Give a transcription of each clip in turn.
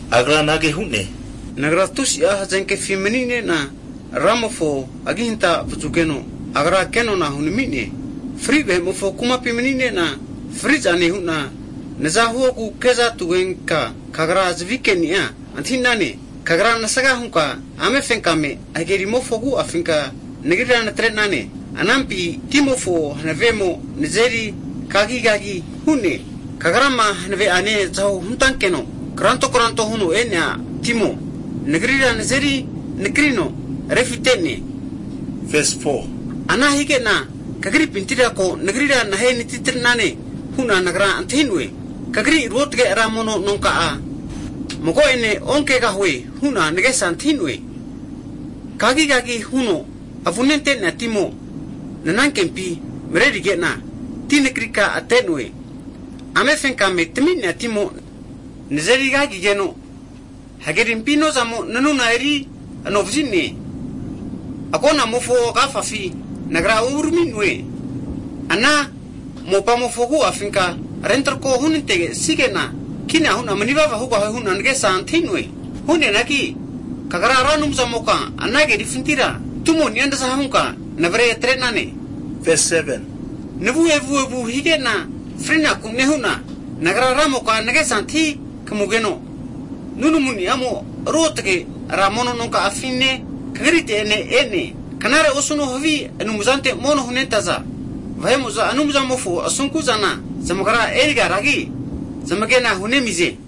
Agra anage hu'ne, Nagra tusi'a hazenkefi mani'ne'na Ramofo agi hanta vazugeno, Agra kenona hunami'ne. Fri vahe'mofo kumapi mani'nena fri'za nehuna naza huogu kezatugenka, kagra zavi ke'ni'a antahi'nane. Kagra nasga hunka ame fenkame hage rimofo agu'afinka nagrira natre'nane. Anampi timofo hnavemo nazeri kagigagi hu'ne. Kagrama hanave'ane zaho hunatankeno kranto kranto huno e'nea timo, nagrira nazeri nakrino refite'ne. Ana hige'na, Kagripintira ko nagrira nahe anatitrenane hu'na nagra antahi'noe. Kagri ruotge ra mono nonka'a (tempol) mago'ene onkegahue, hu'na ngesa antahi'noe. Kagigagi huno avune ante'nea timo, nanankempi mrerige'na ti nakrika ate'noe, Ame fenkame tami'nea timo nazeri kagigeno, Hgerimpi inozamo nanuna eri anovazi'ne. Agonamofo agafafi nagra urami'noe, Ana mopamofo agu'afinka rentrako hunantesige'na kina hu'na manivava hugahue hu'na nagesa antahi'noe. Hu'neanagi, Kagra Ra Anumzamoka, ana kerifintira tumoni'a naza hunka navare atre'nane. Navu evuevu hige'na frinaku nehu'na, nagra Ramoka nagesa antahi kmugeno, nunamuni'amo ruotge ra mono nonka'afine, Kagrite'ene e'ne. Knare osuno havi anumzante mono hunentaza vahe'mo'za, Anumzamofo asunku'zana zamagra erigaragi, zamagena hunemize.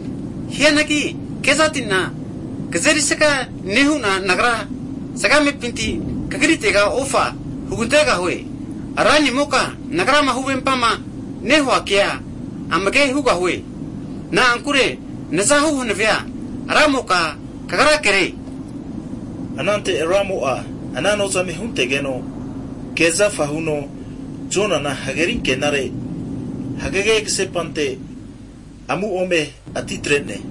Hianagi, Ranimoka kezati'na kagia erisga nehu'na, nagra zgamepinti Kagritega ofa hugantegahue Ranimoka. Nagrama huvempama Ranimokane hua kea, amage hugahue, na'ankure nazahu hanavea Ramoka Kagrakere. Anante Ramo'a ana nozame huntegeno ke zafa huno, Jonana hageri ankenare hagage ksepante amu ome atitre'ne.